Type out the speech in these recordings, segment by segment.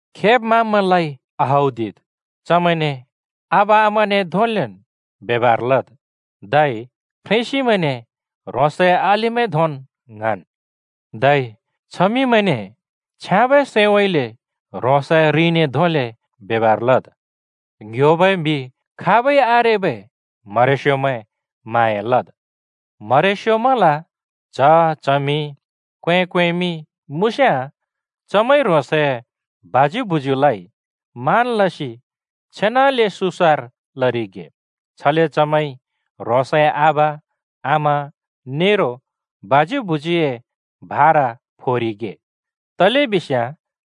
खेब् माँब्मैंलाइ आहौदिद्, चमैंने आबा आमाने धोंलेन् ब्यबर लद्। धै फ्रेंसिमैंने ह्रोंसए अलिमैं धोंन् ङ्हाँन्। धै छमिंमैंने छ्याँबै सैंउँइँले ह्रोंसए रिंने धोंले ब्यबर लद्। ङ्ह्‍योबै म्हि खाबै आरेबै म्हरेस्योमैं म्हाँया लद्। म्हरेस्योमैंल च्‍ह, च्हमि, क्‍वें, क्‍वेंमिं मुँस्‍याँ, चमैंइ ह्रोंसए बाज्यु भुज्‍यूलाइ मान लसि छेनाले सुसार लरिगे, छले चमैंइ ह्रोंसए आबा, आमा नेरो बाज्‍यू भुज्‍यूए भारा फोरिगे, तलेबिस्याँ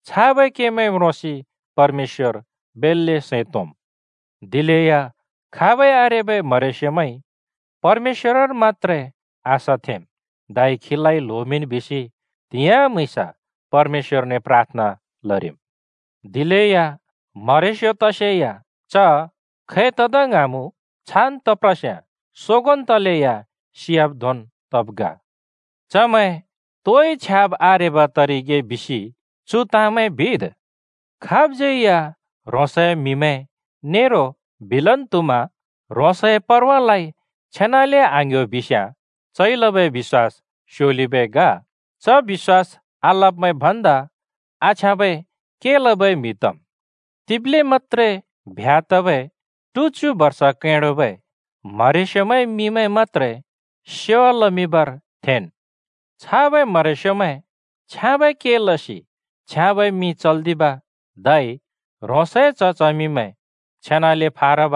छाबै केमैं म्रोंसि परमेश्‍वर बेल्‍ले सैं तोंम्। दिलेया खाबै आरेबै म्हरेस्योमैंइ परमेश्‍वरर मत्‍त्रे आशा थेंम्, धै खीलाइ ल्होमिंन् बिसि त्‍हिंयाँ म्‍हुँइँस परमेश्‍वरने प्राथना लरिम्। दिलेया म्हरेस्यो तसेया च खै तदा ङ्हाँमुँ छान् तप्रस्याँ सोगोंन् तलेया सियाब् धोंन् तब् ग। चमैं तोइ छ्याब् आरेब तरिगे बिसि चु ताँमैं बिद्। खाबज्यै या ह्रोंसए म्हिमैं नेरो बिलन् त्हुमा ह्रोंसए परवालाइ छेनाले आङ्ह्‍यो बिस्‍याँ, चइ लबै बिश्‍वास स्योलिबै ग। च बिश्‍वास आलब्‍मैं भन्दा आछ्याँबै के लबै म्हि तम्। तिब्ले मत्‍त्रे ब्ह्‍या तबै टुच्यु बर्ष कैडोबै म्हरेस्योमैंए मिंमैं मत्‍त्रे सेवा लमिंबर थेंन्। छाबै म्हरेस्योमैं छ्याँबै के लसि छ्याँबै मिं चल्‍दिब धै ह्रोंसए च्‍ह-चमिमैं छेनाले फारब,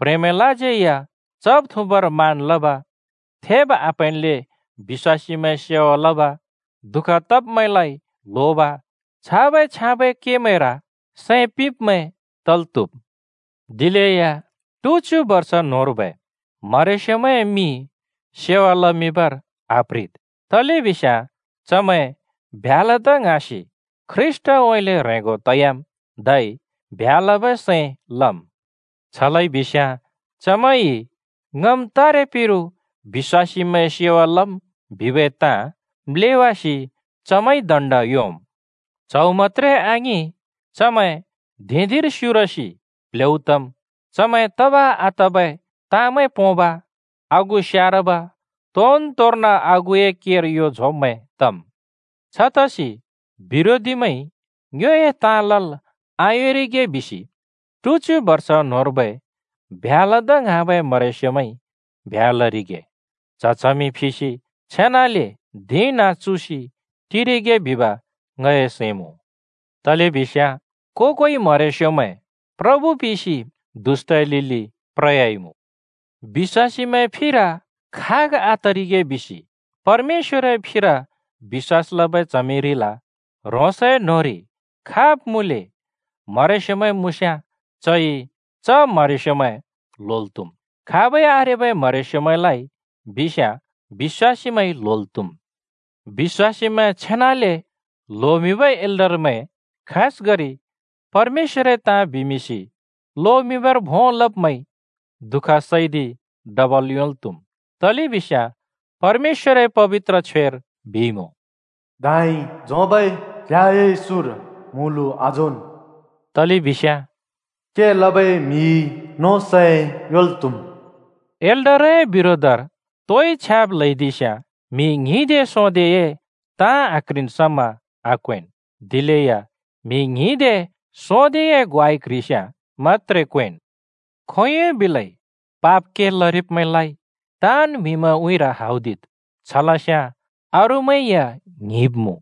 प्ह्रेंमैंलाज्यै या चब् थुँबर मान लब, थेब् आप्हैंनले बिश्‍वासीमैंए सेवा लब, दुःख तब्‍मैंलाइ ल्होब, छाबै छ्याँबै केमैंर सैं पिंब्मैं तल् त्‍हुम्। दिलेया ट्च्यु बर्ष न्होंर्बै म्हरेस्योमैंए मिं सेवा लमिंबर आप्ह्रिद्, तलेबिस्याँ चमैं ब्ह्‍या लदा ङ्हाँसि ख्रीष्‍टउँइँले ह्रेंगो तयाम्, धै ब्ह्‍या लबै सैं लम्। छ लइबिस्‍याँ चमैंइ “ङम् तारे पिरु बिश्‍वासीमैंए सेवा लम्” बिबै ताँ म्‍लेवासि चमैंइ दण्ड योंम्। च्हौ मत्‍त्रे आङिं चमैं धिं-धिंर स्युरसि प्ल्हेउ तम्, चमैं तब-आतबै ताँमैं पोंब, आगु स्यारब, तोनतोंर्न आगुए केर यो झोंब्मैं तम्। छतसि बिरोधीमैंइ ङ्योए ताँ लल् आयोंरिगे बिसि टुच्यु बर्ष न्होंर्बै ब्ह्‍या लदा ङ्हाँबै म्हरेस्योमैंइ ब्ह्‍या लरिगे, च्‍ह-चमि फिसि छेनाले धिं नाँ चुसि टिरिगे बिब ङए सैं मुँ। तलेबिस्याँ को-कोइ म्हरेस्योमैं प्रभु पिसि दुष्‍टए लिलि प्रयाइमुँ। बिश्‍वासीमैंए फिर खाग आतरिगे बिसि परमेश्‍वरए फिर बिश्‍वास लबै च्हमिरिल ह्रोंसए न्होंरि खाब् मुँले म्हरेस्योमैं मुँस्‍याँ, चइ च म्हरेस्योमैं ल्होल् त्हुम्। खाबै आरेबै म्हरेस्योमैंलाइ बिस्याँ बिश्‍वासीमैंइ ल्होल् त्‍हुम्। बिश्‍वासीमैं छेनाले ल्होमिंबै एल्डरमैं, खासगरि परमेश्‍वरए ताँ बिमिंसि लोमिंबर भों लब्मैंइ दुःख सैदि डबल योंल् त्हुम्। तलेबिस्याँ परमेश्‍वरए पबित्र छ्वेर बिइमुँ “दाँइ झोंबै क्‍ल्‍याए सुँर म्‍हुँलु आझोंन्।” तलेबिस्याँ “के लबै म्‍हिइ नों सै योंल् त्हुम्।” एल्डरए बिरोधर तोइ छ्याब् ल्हैदिस्याँ म्हि ङ्हिंदे सोंदेए ताँ आक्ह्रिन् समा आक्‍वेंन्, दिलेया म्‍हि ङ्हिंदे, सोंदेए ग्वाइ क्‍ह्रिस्‍याँ मत्‍त्रे क्‍वेंन्। खोंयोंइ बिलै पाप के लरिब्‍मैंलाइ ताँन् म्‍हिमैंए उँइँर हौदिद्। छ लस्‍याँ अरूमैं या ङ्हिंब्मुँ।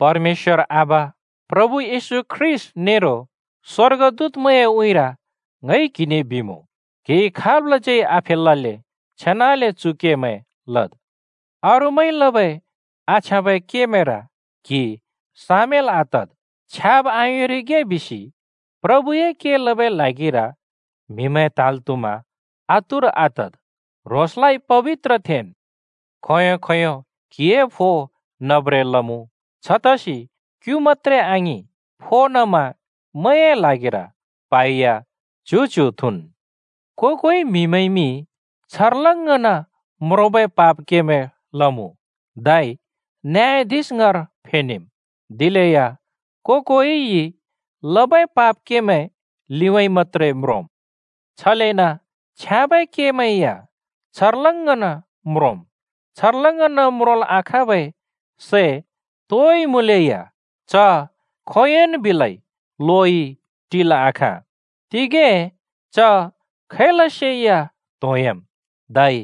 परमेश्‍वर आबा, प्रभु येशू ख्रीष्‍ट नेरो स्‍वर्गदूतमैंए उँइँर ङइ क्हिने बिमुँ, क्हिइ खाबलाज्यै आफेलल्‍ले छेनाले चु केमैं लद्। अरूमैंइ लबै आछ्याँबै केमैंर क्हि सामेल् आतद्। छ्याब आयोंरिगे बिसि प्रभुए के लबै ल्हागिर म्हिमैं त्हाँल् त्हुमा आतुर आतद्। ह्रोंसलाइ पबित्र थेंन्। खों-खोंयों क्हिए फो नब्रें लमुँ, छतसि क्यु मत्‍त्रे आङिं, फो नमा मैए ल्हागिर प्हा या दे-दे थुँन्। को-कोइ म्‍हिमैंइमि छर्लङ्गन् म्रोंबै पाप केमैं लमुँ धै नियाधिश ङाँर फेनेम्, दिलेया को-कोइइ लबै पाप केमैं लिउँइँ मत्‍त्रे म्रोंम्। छलेन छ्याँबै केमैं या छर्लङ्गन् म्रोंम्, छर्लङ्गन् म्रोंल् आखाँबै सै तोइ मुँलेया च खोंयोंन् बिलै लोइ टिल् आखाँ, तिंगें च खैलसे या त्होंयाम् धै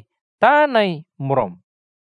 ताँनइ म्रोंम्।